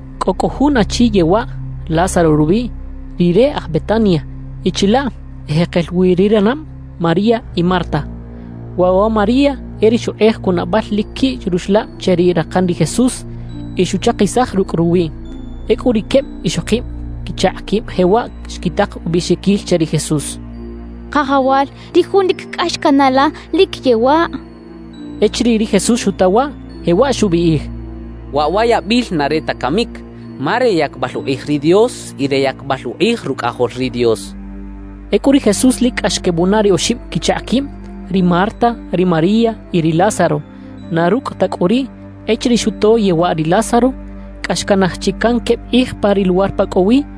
Cꞌo cꞌu jun achi yewaꞌ, Lázaro rubiꞌ. Rire aj Betania, y chilaꞌ ejekel wi ri ranab María y Marta. Waꞌ wa María e ri xukꞌej cunabal lic quiꞌ ruxlab che ri rakan ri Jesús y xuchakisaj rucꞌ ruwiꞌ. Ecꞌu ri queb ixokib quichakꞌ quib jewaꞌ xquitak ubiꞌxiquil che ri Jesús: «Kajawal, ri jun lic cꞌax canaꞌ la, lic yewaꞌ.» Echiriꞌ ri Jesús xuta waꞌ, jewaꞌ xubiꞌij: «Waꞌ wa yabil na re ta camic, ma re yacbal ukꞌij ri Dios y re yacbal ukꞌij Rucꞌajol ri Dios» xchaꞌ. Ecꞌu ri Jesús lic cꞌax quebunaꞌ ri oxib quichakꞌ quib: Ri Marta, ri María y ri Lázaro. Na rucꞌ ta cꞌu riꞌ, echiriꞌ xuto yewaꞌ ri Lázaro, cꞌa xcanaj chi can queb kꞌij pa ri luwar pa cꞌo wi.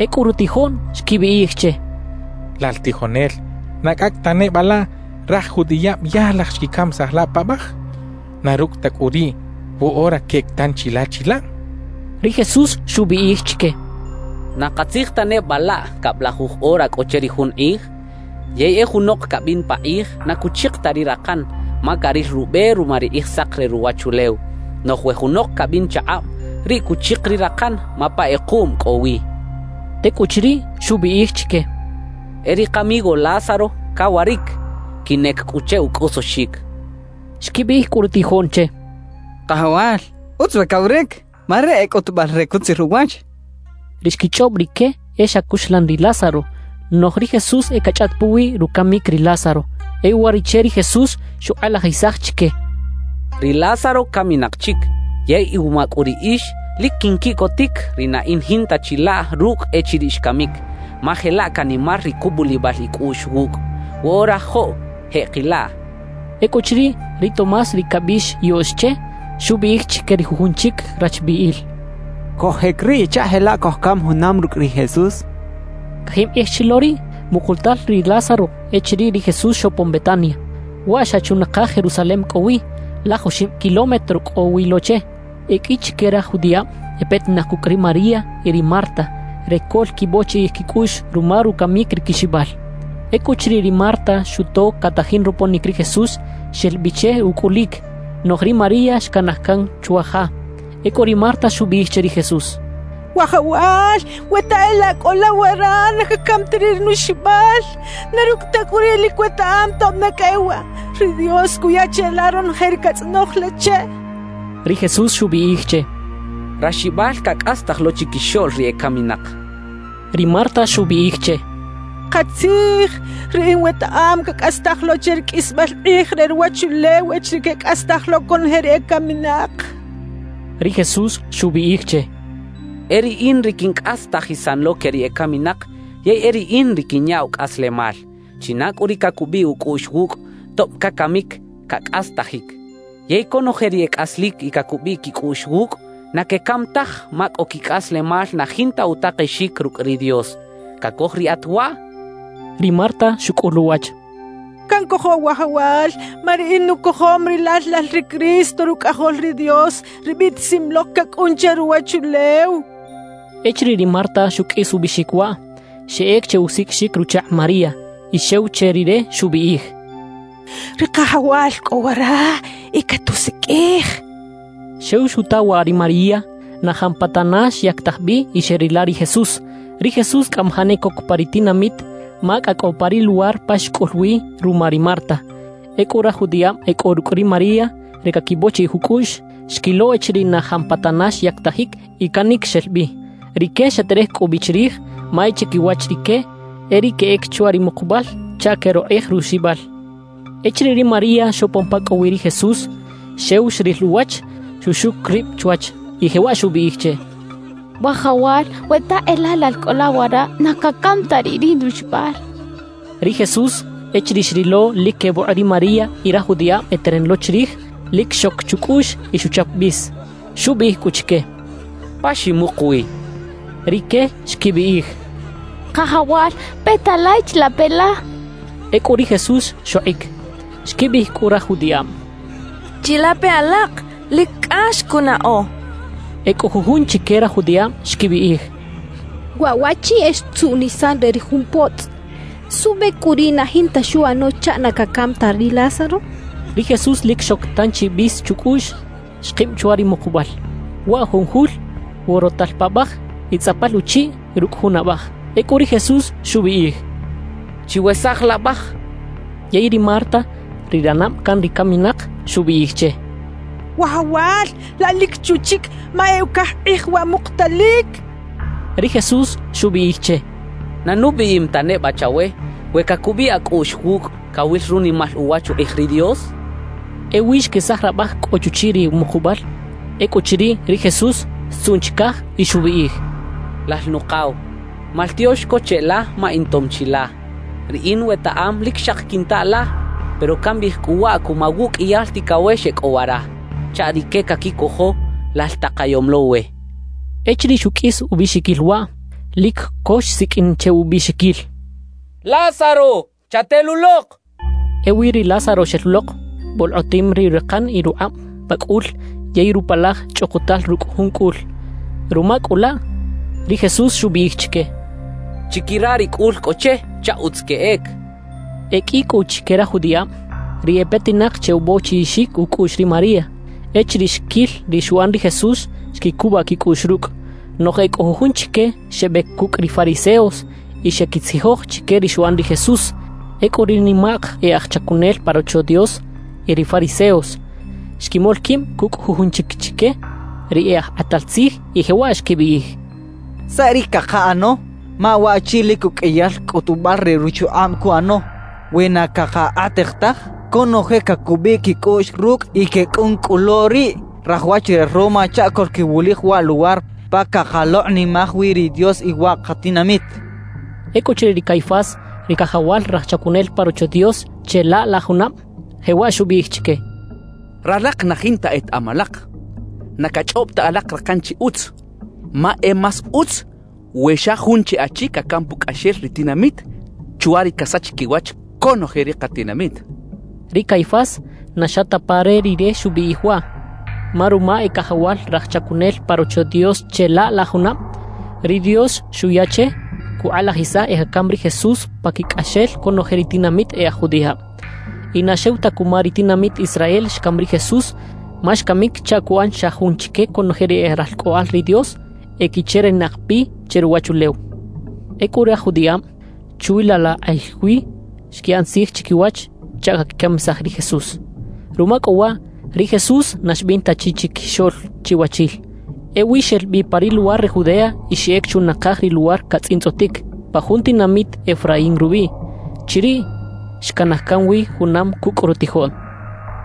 Ecꞌu rutijoꞌn xquibiꞌij che: —Lal tijonel, ¿na cꞌacꞌ ta neba laꞌ raj judiꞌab ya laj xquicamisaj la paꞌbaj? Na rucꞌ ta cꞌu riꞌ, ¿woꞌora queꞌec tanchi la chilaꞌ? —xechaꞌ. Ri Jesús xubiꞌij chique: —¿Na katzij ta neba laꞌ cablajuj ora cꞌo che ri jun kꞌij? Yey e junok cabin pakꞌij na cuchik ta ri rakan, ma caril rube ruma ri kꞌijsak re ruwachulew. Noꞌj we junok cabin chakꞌab, riꞌ cuchik ri rakan ma pa kꞌekuꞌm cꞌo wi —xchaꞌ. Tecꞌuchiriꞌ, xubiꞌij chique: —E ri kamigo Lázaro, cawaric. Quinꞌec cꞌu che ucꞌosoxic —xchaꞌ. Xquibiꞌij cꞌu rutijoꞌn che: —Kajawal, utz we cawaric, ma riꞌ e cꞌutubal re cutzir uwach —xechaꞌ. Ri xquichꞌob rique e xa cuxlan ri Lázaro; noꞌj ri Jesús e cachꞌaꞌt puwi rucamic ri Lázaro. E uwariꞌche ri Jesús xukꞌalajisaj chique: —Ri Lázaro caminak chic. Yey iwuma cꞌu riꞌix, lic quinquiꞌcotic ri na in jinta chilaꞌ rucꞌ echiriꞌ xcamic, ma jelaꞌ canimar ri cubulibal icꞌuꞌx wucꞌ. Woꞌora joꞌ, jeꞌkilaꞌ —xchaꞌ. Ecꞌuchiriꞌ, ri Tomás ri cabiꞌx “Yoꞌx” che, xubiꞌij chique ri jujun chic rachbiꞌil: —Cojꞌec riꞌ chaꞌ jelaꞌ cojcam junam rucꞌ ri Jesús —xchaꞌ. Cajib kꞌij chi lo riꞌ mukutal ri Lázaro echiriꞌ ri Jesús xopon Betania. Waꞌ xa chunakaj Jerusalem cꞌo wi, laj oxib kilómetro cꞌo wi lo che. E qꞌui chique raj judiꞌab e petinak cucꞌ ri María y ri Marta re coꞌlquibochiꞌij quicꞌuꞌx ruma rucamic ri quixibal. Ecꞌuchiriꞌ ri Marta xuto catajin roponic ri Jesús, xel bi che ucꞌulic; noꞌj ri María xcanaj can chwa ja. Ecꞌu ri Marta xubiꞌij che ri Jesús: —Wajawal, we ta e laꞌ cꞌo la wara, na cacam ta riꞌ ri nuxibal. Na rucꞌ ta cꞌu riꞌ, lic wetaꞌam, tob ne cꞌa e waꞌ, ri Dios cuya cheꞌla ronoje ri catzꞌonoj la che —xchaꞌ. Ri Jesús xubiꞌij che: —Raxibal cacꞌastaj lo chiquixoꞌl ri ecaminak —xchaꞌ. Ri Marta xubiꞌij che: —Katzij, riꞌin wetaꞌam cacꞌastaj lo che ri qꞌuisbal kꞌij re ruwachulew echiriꞌ quecꞌastaj lo conoje ri ecaminak —xchaꞌ. Ri Jesús xubiꞌij che: —E riꞌin ri quincꞌastajisan lo que ri ecaminak yey e riꞌin ri quinyaꞌw cꞌaslemal. China cꞌu ri cacubiꞌ ucꞌuꞌx wucꞌ, tob cacamic, cacꞌastajic. Yey conoje ri e cꞌaslic y cacubiꞌ quicꞌuꞌx wucꞌ, na quecam taj ma cꞌo quicꞌaslemal na jinta utakexic rucꞌ ri Dios. ¿Cacoj riꞌat waꞌ? —xchaꞌ. Ri Marta xucꞌul uwach: —Cancojo, Wajawal, ma riꞌin nucojom rilal lal ri Cristo, Rucꞌajol ri Dios, ri biꞌtisim lok cacꞌun che ruwachulew —xchaꞌ. Echiriꞌ ri Marta xuqꞌuis ubiꞌxic waꞌ, xeꞌec che usiqꞌuixic ruchakꞌ María y xew che rire xubiꞌij: —Ri Kajawal cꞌo wara y catusiqꞌuij —xchaꞌ. Xew xuta waꞌ ri María, na jampatana xyactaj bi y xeꞌrila ri Jesús. Ri Jesús cꞌamajaꞌ ne coc pa ri tinamit, ma cꞌa cꞌo pa ri luwar pa xcꞌul wi ruma ri Marta. Ecꞌu raj judiꞌab e cꞌo rucꞌ ri María re caquibochiꞌij ucꞌuꞌx, xquilo echiriꞌ na jampatana xyactajic y canic xel bi. Rique xeterej cꞌu bi chirij, ma e chiquiwach rique e riꞌ queꞌec chwa ri mukubal chaꞌ queꞌrokꞌej ruxibal. Echiriꞌ ri María xopon pa cꞌo wi ri Jesús, xew xril uwach, xuxuc rib chwach, y jewaꞌ xubiꞌij che: —Wajawal, we ta e laꞌ lal cꞌo la wara, na cacam ta riꞌ ri nuxibal —xchaꞌ. Ri Jesús echiriꞌ xrilo lic quebokꞌ ri María y raj judiꞌab eteran lo chirij, lic xoc chucꞌuꞌx y xuchap bis. Xubiꞌij cꞌu chique: —¿Pa ximuk wi? —xchaꞌ. Rique xquibiꞌij: —Kajawal, peta la y chilape la —xechaꞌ. Ecꞌu ri Jesús xokꞌic. Xquibiꞌij cꞌu raj judiꞌab: —¡Chilape alak, lic cꞌax cunaꞌo! —xechaꞌ. E cꞌo jujun chique raj judiꞌab xquibiꞌij: —Wa waꞌchi e xtzuꞌnisan re ri jun potzꞌ. ¿Suꞌbe cꞌu riꞌ na jinta xuꞌano chaꞌ na cacam ta ri Lázaro? —xechaꞌ. Ri Jesús lic xoc tanchi bis chucꞌuꞌx, xkib chwa ri mukubal. Waꞌ jun jul worotal paꞌbaj y tzꞌapal uchiꞌ rucꞌ jun abaj. Ecꞌu ri Jesús xubiꞌij: —Chiwesaj laꞌbaj —xchaꞌ. Yey ri Marta, ri ranab can ri caminak, xubiꞌij che: —Wajawal, laꞌ lic chu chic, ma e ucaj kꞌij waꞌ mukutalic —xchaꞌ. Ri Jesús xubiꞌij che: —¿Na nubiꞌim ta neba chawe, we cacubiꞌ acꞌuꞌx wucꞌ, cawil runimal uwach ukꞌij ri Dios? —xchaꞌ. Ewi xquesaj rabaj cꞌo chuchiꞌ ri mukubal. Ecꞌuchiriꞌ, ri Jesús xtzuꞌn chicaj y xubiꞌij: —Lal Nukaw, maltiox co cheꞌla ma intom chi la. Riꞌin wetaꞌam lic xaki quinta la, pero cambiꞌij cꞌu waꞌ cuma wuꞌqꞌuiyal ticawex e cꞌo wara, chaꞌ rique caquicojo lal takayom lo we —xchaꞌ. Echiriꞌ xuqꞌuis ubiꞌxiquil waꞌ, lic co xsiqꞌuin che ubiꞌxiquil: —¡Lázaro, chatelulok! —xchaꞌ. Ewi ri Lázaro xel lok, bolkꞌotim ri rakan y rukꞌab pa cꞌul yey rupalaj chꞌukutal rucꞌ jun cꞌul. Ruma cꞌu laꞌ, ri Jesús xubiꞌij chique: —Chiquira ri cꞌul cꞌo che chaꞌ utz queꞌec —xchaꞌ. E qꞌui cꞌu chique raj judiꞌab, ri e petinak che ubochiꞌixic ucꞌuꞌx ri María, echiriꞌ xquil ri xuꞌan ri Jesús, xquicubaꞌ quicꞌuꞌx rucꞌ. Noꞌj e cꞌo jujun chique xebec cucꞌ ri fariseos, y xeꞌquitzijoj chique ri xuꞌan ri Jesús. Ecꞌu ri nimak e aj chacunel pa Rocho Dios y ri fariseos xquimol quib cucꞌ jujun chic chique ri e aj kꞌatal tzij y jewaꞌ xquibiꞌij: —¿Saꞌ ri cakaꞌano? Ma waꞌchi lic uqꞌuiyal cꞌutubal re ruchukꞌab cuꞌano. We na cakakꞌatej taj, conoje cacubiꞌ quicꞌuꞌx rucꞌ y quecꞌun cꞌu lo riꞌ raj wach re Roma chaꞌ coꞌlquiwulij wa Luwar pa cakalokꞌnimaj wi ri Dios y wa katinamit —xechaꞌ. Ecꞌuchiriꞌ ri Caifás, ri cajawal raj chacunel pa Rocho Dios che laꞌ la junab, jewaꞌ xubiꞌij chique: —Ralak na jinta etaꞌam alak. Na cachꞌob ta alak rakan chi utz, ma e más utz we xa jun chi achi cacam pucꞌaxel ri tinamit chwa ri casach quiwach conoje ri katinamit —xchaꞌ. Ri Caifás na xa ta pa re rire xubiꞌij waꞌ. Ma ruma e cajawal raj chacunel pa Rocho Dios che laꞌ la junab, ri Dios xuya che cukꞌalajisaj e cacam ri Jesús paquicꞌaxel conoje ri tinamit e aj judiꞌab. Y na xew ta cuma ri tinamit Israel xcam ri Jesús, ma xcamic chaꞌ cuꞌan xa jun chique conoje ri e ralcꞌoꞌal ri Dios equicherinak bi che ruwachulew. Ecꞌu raj judiꞌab chwi laꞌ la kꞌij wi xquiꞌan tzij chiquiwach chaꞌ caquicamisaj ri Jesús. Ruma cꞌu waꞌ, ri Jesús na xbin ta chi chiquixoꞌl chiwachil. Ewi xel bi pa ri luwar re Judea y xeꞌec chunakaj ri luwar catzꞌintzꞌotic, pa jun tinamit Efraín rubiꞌ. Chiriꞌ xcanaj can wi junam cucꞌ rutijoꞌn.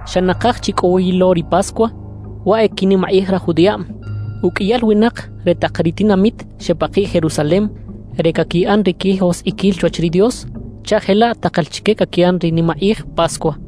Xa nakaj chi cꞌo wi lo ri Pascua, waꞌ e quinimakꞌij raj judiꞌab. Uqꞌuiyal winak re tak ri tinamit xepakiꞌ Jerusalem re caquiꞌan ri quijoskꞌiquil chwach ri Dios, chaꞌ jelaꞌ takal chique caquiꞌan ri nimakꞌij Pascua.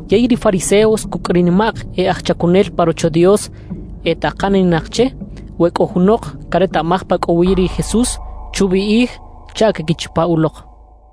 Yey ri fariseos cucꞌ ri nimak e aj chacunel pa Rocho Dios etakaninak che we cꞌo junok caretaꞌmaj pa cꞌo wi ri Jesús, chubiꞌij chaꞌ queꞌquichapa ulok.